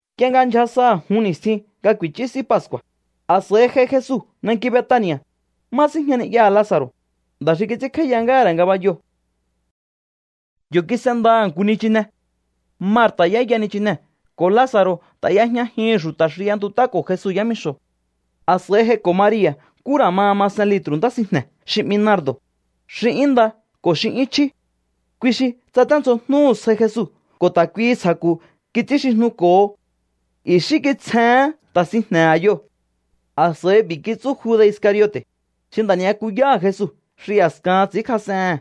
Nk'ie nga ndyja sa jun ni̱stjin nga ku̱i̱chú S'í Pascu̱a̱, a̱s'a̱i j'ai Jesu nanki Betani̱a̱, má síjña ni'yaha̱ Laza̱ro̱, nda̱ xi kits'ínkj'áíya ngáha̱ ra̱ ngabayoo̱. Yo̱ kis'endaha̱ nku nichine. Marta̱ y'éya nichinee̱ ko̱ Laza̱ro̱ ta̱ y'ejñajihi̱n xu̱ta̱ xi y'entut'áko̱ Jesu yámixo̱. A̱s'a̱i j'aiko̱ Maria̱ nkú ra̱ ma masen litru̱ ntá sinjne̱ xi 'mi nardo̱, xi 'yún nda ko̱ xi 'yún chjí. Kui xi tsaténdzjojnúhu̱ sjai Jesu ko̱ ta̱ kuihi ntsja̱ku̱ kits'ínxijnuko̱ho. I̱xí kitsjehén nta̱ sinjne̱ a̱yoo̱. A̱s'a̱i b'i̱ kitsú Juda̱ Iscariote̱, xi nda̱ ni'yakuyáha̱ Jesu xi a̱skahan ts'i̱ínkjas'ehe̱n: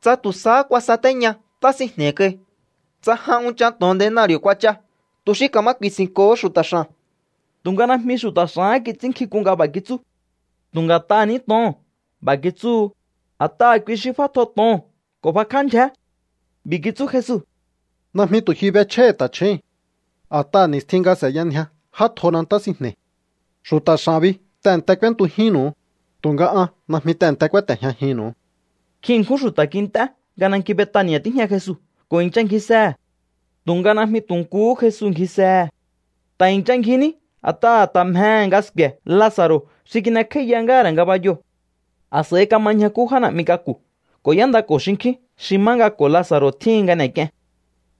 —Tsa tu̱ sahá kuasatéña ntá sinjne̱i̱ kai. Tsa jan unchan to̱on denari̱o̱ kuach'a, tu̱ xi ka̱ma ku̱i̱si̱nko̱ho xu̱ta̱ x'a̱n. Tu̱nga najmi xu̱ta̱ x'a̱hán kits'ínnkjink'un nga b'a̱ kitsú. Tu̱ nga̱t'aha̱ ní to̱oo̱n b'a̱ kitsúhu, a̱t'aha̱ kui xi f'átjo to̱oo̱n ko̱ bakjá ndyjé. B'i̱ kitsú Jesu: —Najmi tu̱ ji b'echj'áíhi̱ ta̱chjúu̱n. A̱t'aha̱ ni̱stjin nga s'e̱yanjia j'átjona ntá sinjne̱i̱. Xu̱ta̱ x'a̱n bi tehe̱nte k'úéntujínnu̱u, tu̱nga an najmi tehe̱nte kúáte̱jñajinnu̱u. Nkjin ṉkjún xu̱ta̱ kint'é nga nanki Betani̱a̱ tíjña Jesu ko̱ i̱ncha ngjisehe̱. Tu̱nga najmi tu̱ nkuhú Jesu ngjisehe̱. Ta̱ i̱ncha ngji ní a̱t'aha̱ ta̱ mjehe̱ nga sku̱e̱ Laza̱ro̱ xi kin'ekj'áíya ngáha̱ ra̱ ngabayoo̱. A̱s'a̱i kama ñjakú já na̱'mi k'aku̱ ko̱ y'éndako̱ xinkjín xi má nga ko̱ Laza̱ro̱ tjíhin nga n'e̱k'ien.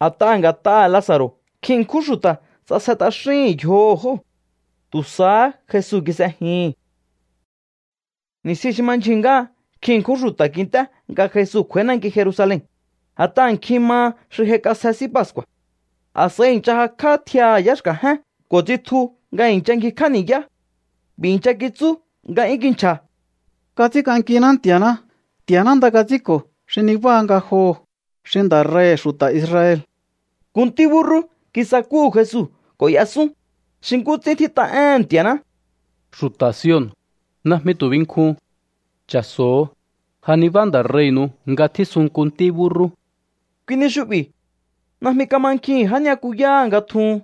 A̱t'aha̱ nga̱t'aha̱ Laza̱ro̱ nkjin ṉkjún xu̱ta̱ ts'asje t'axíhi̱n yjoho̱ jóo̱. Tu̱ sahá Jesu kis'ejihi̱n. Ni̱stjin xi ma ndyjuu̱n ngáha nkjin ṉkjún xu̱ta̱ kint'é nga Jesu kj'u̱a̱í nanki Jerusalen, a̱t'aha̱ nkjin maha xi j'aik'asje S'í Pascu̱a̱. A̱s'a̱i i̱ncha jakj'á tjiaha̱ yá xka̱jén ko̱ tsitju nga i̱ncha ngjikj'á ni̱yá. B'i̱ i̱ncha kitsú nga 'yún kinchja̱: —¡Kats'ínk'ankiná Nti̱a̱ná! ¡Nti̱a̱ná nda kats'ínko̱ xi nibáha ngajoho̱, xi Nda̱ Rei̱hi̱ xu̱ta̱ Israel! Nku ntí búrrú kisakúhu̱ Jesu ko̱ y'esún, xi nkú ts'ín tjít'a éhe̱n Nti̱a̱ná: Xu̱ta̱ Sion, najmi tu̱ binkjun. Cha̱so̱o, ja nibá Nda̱ Rei̱nu̱u nga tjísun nku ntí búrrú. Kui ni xu'bi̱ najmi kamankjihi̱n já ni'yakuyáha̱ nga tjuhun.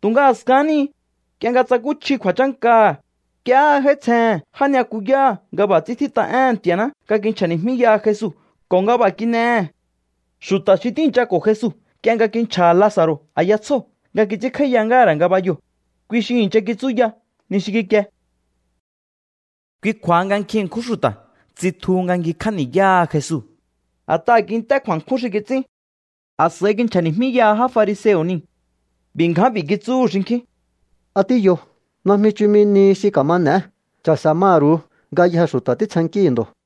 Tu̱nga a̱skahán ni, nk'ie nga tsakúchji kju̱a̱chánkaha̱, nk'iehé j'áítsjehe̱n já ni'yakuyáha̱ nga b'a̱ ts'ín tjít'a éhe̱n Nti̱a̱ná nga kinchja̱ni̱jmíyaha Jesu ko̱ nga b'a̱ kin'ehe̱. Xu̱ta̱ xi tíi̱nchako̱ Jesu nk'ie nga kinchja̱ha̱ Laza̱ro̱ a̱ya tsjóo̱ nga kits'ínkj'áíya ngáha̱ ra̱ ngabayoo̱, kui xi i̱ncha kitsúya ni xi kikie. Kui kju̱a̱ha nga nkjin ṉkjún xu̱ta̱ tsitjuhu nga ngjikj'á ni̱yáha Jesu, a̱t'aha̱ kint'é kju̱a̱nkjún xi kits'ín. A̱s'a̱i kinchja̱ni̱jmíyaha já fariseo̱ niu̱. B'i̱ ngján b'i̱ kitsúhu̱ xinkjín: —¿A tíyo? Najmi chumi nihi xi ka̱ma n'e̱é. Cha̱se̱ maru̱u. Ngayjee̱ xu̱ta̱ títsjennkíhi̱ ndo̱.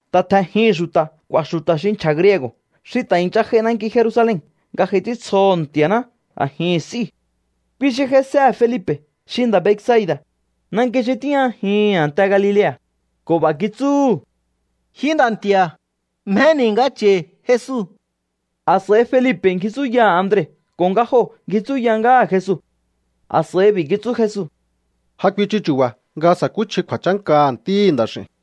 Ta tje̱njihi̱n xu̱ta̱ k'u̱a̱ xu̱ta̱ xi nchja̱ griego̱ xi ta̱ i̱ncha j'ai nanki Jerusalen nga j'ai ts'íntsjoho̱ Nti̱a̱ná a̱jihi̱n s'íu̱. Kui xi j'aisehe̱ Felipe̱ xi nda̱ Betsaida̱, nanki xi tíjñajihi̱n a̱nte Galilea̱, ko̱ b'a̱ kitsúhu̱: —Ji nda̱ nti̱a̱, mjeni̱ nga cha̱i̱ Jesu. A̱s'a̱i Felipe̱ ngji tsúyaha̱ Andre ko̱ nga joo̱ ngji tsúya ngáha̱ Jesu. A̱s'a̱i b'i̱ kitsú Jesu: —Ja kuichu chu̱ba̱ nga sa̱kúchji kju̱a̱chánkaha̱ Ntíhi̱ Nda̱x'i̱u̱n.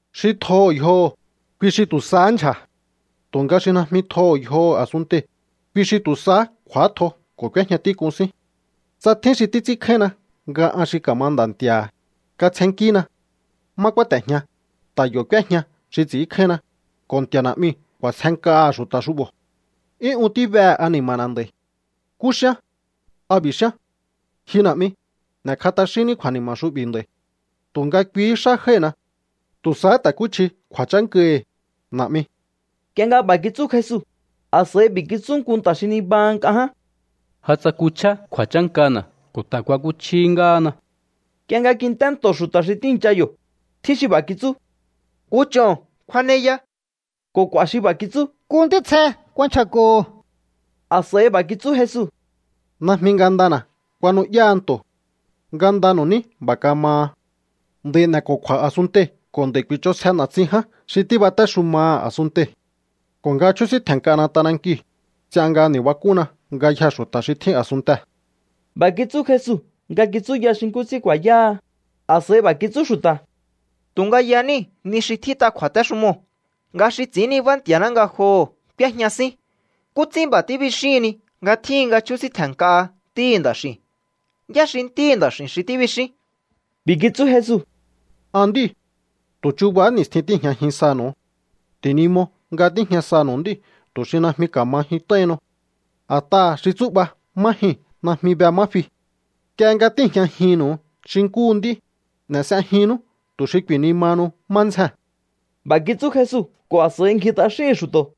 Xi tjoho̱ yjoho̱, kui xi tu̱ sahá ndyja̱. Tu̱nga xi najmi tjoho̱ yjoho̱ a̱sunntei̱, kui xi tu̱ sahá kj'u̱átjo ko̱ k'úéjña tík'un sín. Tsa tjín xi títs'ínkjáínna nga an xi ka̱ma Nda̱ Nti̱a̱ha̱, katsjennkína. Má kúáte̱jña, ta̱ yo̱ k'úéjña xi ts'i̱ínkjáínna, ko̱ Nti̱a̱ Na̱'miu̱ k'u̱a̱sjenk'aha̱ xu̱ta̱ xu'bo̱. ’'Yún un tíbehe̱ ani̱ma̱na̱ nd'a̱i̱. ¿Nkú xíán? ¿A b'i̱ xíán: Ji Na̱'mi, n'e̱kj'a t'axínní kju̱a̱ni̱ma̱ xu'bi̱ nd'a̱i̱? Tu̱nga kuihí xá jái̱hina. Tu̱ sahá ta̱kúchji kju̱a̱chánkahi̱, Na̱'mi. Nk'ie nga b'a̱ kitsú Jesu, a̱s'a̱i b'i̱ kitsú nku nta̱ xi nibaha nk'a ján: —Ja tsakuchjá kju̱a̱chánkana̱ ko̱ ta̱ kuakuchjíhí ngáhana. Nk'ie nga kint'é nto̱ xu̱ta̱ xi tíi̱ncha yo̱, tjín xi b'a̱ kitsú: —Nku ch'o̱n kjuaneya. Ko̱ k'u̱a̱ xi b'a̱ kitsú: —Nku ntítsje kuanchja̱ko̱ho̱. A̱s'a̱i b'a̱ kitsú Jesu: —Najmi ngandana̱ kuanu'yáha nto̱. Ngandanu̱ ní b'a̱ kamaha. Nd'a̱i̱ n'e̱ko̱kju̱a̱ a̱sunntei̱ ko̱ nd'a̱i̱ ku̱i̱ch'onsje na̱tsin ján xi tíbatéxumaha̱ a̱sunntei̱. Ko̱ nga chjúsíntje̱n nk'ana t'anankiu̱, ts'ian nga ni̱bak'únna ngayjee̱ xu̱ta̱ xi tjín a̱sunntee̱. B'a̱ kitsú Jesu nga kitsúya xi nkú ts'ín ku̱a̱yáha. A̱s'a̱i b'a̱ kitsú xu̱ta̱: —Tu̱nga yaníi̱ ni xi tjít'a kju̱a̱téxumoo̱, nga xi ts'i̱ín nibá Nti̱a̱ná ngajoho̱ k'úéjña sín. ¿Nkú ts'ín b'a̱ tíbixíhinni nga tjíhin nga chjúsíntje̱n nk'aha Ntíhi̱ Nda̱x'i̱u̱n? ¿Yá xi Ntíhi̱ Nda̱x'i̱n xi tíbixín? B'i̱ kitsú Jesu: —An nd'íu̱. Tu̱ chuba ni̱stjihín tíi̱jñajin sanu̱u. Ti̱nimo nga tíjña sanu̱u nd'íu̱ tu̱ xi najmi ka̱ma jyunt'aihinnu. A̱t'aha̱ xi tsú'ba má jyuu̱n najmi be má fi. Nk'ie nga tíi̱jñajinnu̱u xi nkúhu nd'í, n'e̱ s'ejinnú tu̱ xi ku̱i̱nimahanu má ndzjee̱n. B'a̱ kitsú Jesu ko̱ a̱s'a̱i ngji t'axíhi̱n xu̱to̱.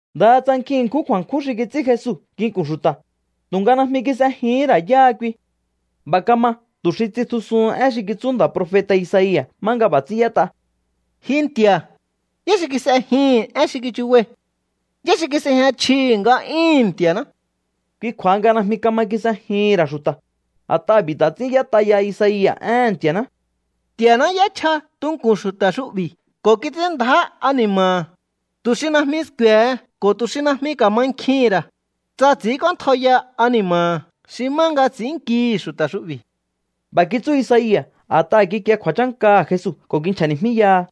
Ndaha tsa nkjin ṉkjún kju̱a̱nkjún xi kits'ín Jesu nginku̱n xu̱ta̱, tu̱nga najmi kis'ejihín ra̱ yáha kui. B'a̱ kama tu̱ xi tsitjusuhun én xi kitsú nda̱ profeta̱ Isaia̱ má nga b'a̱ ts'ín y'ét'a: Ji Nti̱a̱, ¿yá xi kis'ejihi̱n én xi kichubai̱? ¿Yá xi kis'ejña chjihi̱ nga'yúhu̱n Nti̱a̱ná? Kui kju̱a̱ha nga najmi kama kis'ejihi̱n ra̱ xu̱ta̱, a̱t'aha̱ b'i̱ ta̱ ts'ín y'ét'a ya Isaia̱ éhe̱n Nti̱a̱ná: Nti̱a̱ná y'échja tunku̱n xu̱ta̱ xu'bi̱ ko̱ kits'ín ndjá ani̱ma̱ha̱, tu̱ xi najmi sku̱e̱he ko̱ tu̱ xi najmi ka̱mankjihi̱n ra̱, tsa ts'i̱ínk'óntjaiya ani̱ma̱ha̱ xi má nga ts'innkíhi̱ xu̱ta̱ xu'bi̱. B'a̱ kitsú Isaia̱ a̱t'aha̱ kikie kju̱a̱chánkaha̱ Jesu ko̱ kinchja̱ni̱jmíyaha.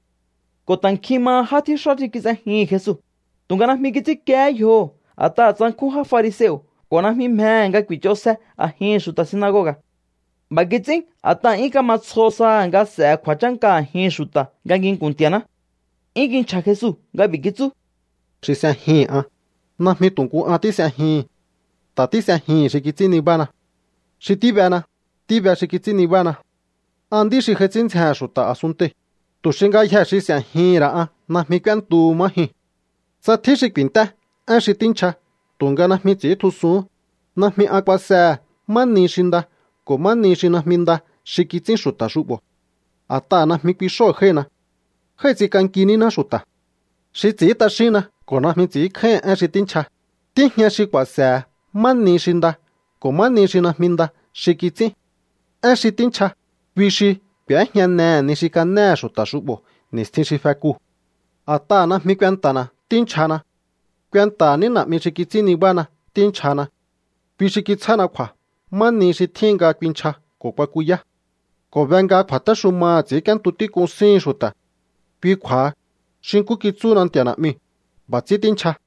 Ko̱ ta̱ nkjin maha já tjíxá xi kis'ejihi̱n Jesu, tu̱nga najmi kits'ínkiehé yjoho̱ a̱t'aha̱ tsankjún já fariseo̱ ko̱ najmi mjehe̱ nga ku̱i̱ch'onsje a̱jihi̱n xu̱ta̱ sinagoga̱. B'a̱ kits'ín a̱t'aha̱ 'yún kama tsjo saha̱ nga s'e̱he̱ kju̱a̱chánka a̱jihi̱n xu̱ta̱ nga nginku̱n Nti̱a̱ná. 'Yún kinchja̱ Jesu nga b'i̱ kitsú: —Xi s'ejihi̱n an, najmi tu̱ nku an tís'ejihi̱n. Ta̱ tís'ejihi̱n xi kits'ín nibána. Xi tíbena, tíbe xi kits'ín nibána. An nd'í xi j'ai ts'ín ndzjehe̱n xu̱ta̱ a̱sunntei̱, tu̱ xi ngayjee̱ xi s'e̱jihi̱n ra̱ an najmi k'úéntuhu má jyuu̱n. ’Tsa tjín xi ku̱i̱nt'é én xi tínchja tu̱nga najmi ts'i̱íntjusuhún, najmi an kuasehe̱ má ni xi nda ko̱ má ni xi najmi nda xi kits'ín xu̱ta̱ xu'bo̱. A̱t'aha̱ najmi kui xóo̱ jái̱hina. Jái̱ ts'ink'anki níná xu̱ta̱. Xi ts'i̱ín t'axínna ko̱ najmi ts'i̱ínkjáíhi̱n én xi tínchja, tíjña xi ku̱a̱se̱he̱ má ni xi nda ko̱ má ni xi najmi nda xi kits'ín. Én xi tínchja, kui xi k'u̱éjñanehe̱ ni xi kanéhe̱ xu̱ta̱ xu'bo̱ ni̱stjin xi fekuu̱. ’A̱t'aha̱ najmi kuenta̱na̱ tínchjahana. Kuenta̱ha̱ ní Na̱'mi xi kits'ín nibána tínchjahana. Kui xi kitsjána kju̱a̱ má nihi xi tjíhin nga kuinchja ko̱ kuakuyá. Ko̱ be nga kju̱a̱téxumaha̱ ts'i̱ínk'íéntu tík'un síhi̱n xu̱ta̱. Kui kju̱a̱ha, xi nkú kitsúhuna Nti̱a̱ Na̱'miu̱, b'a̱ ts'ín tínchja.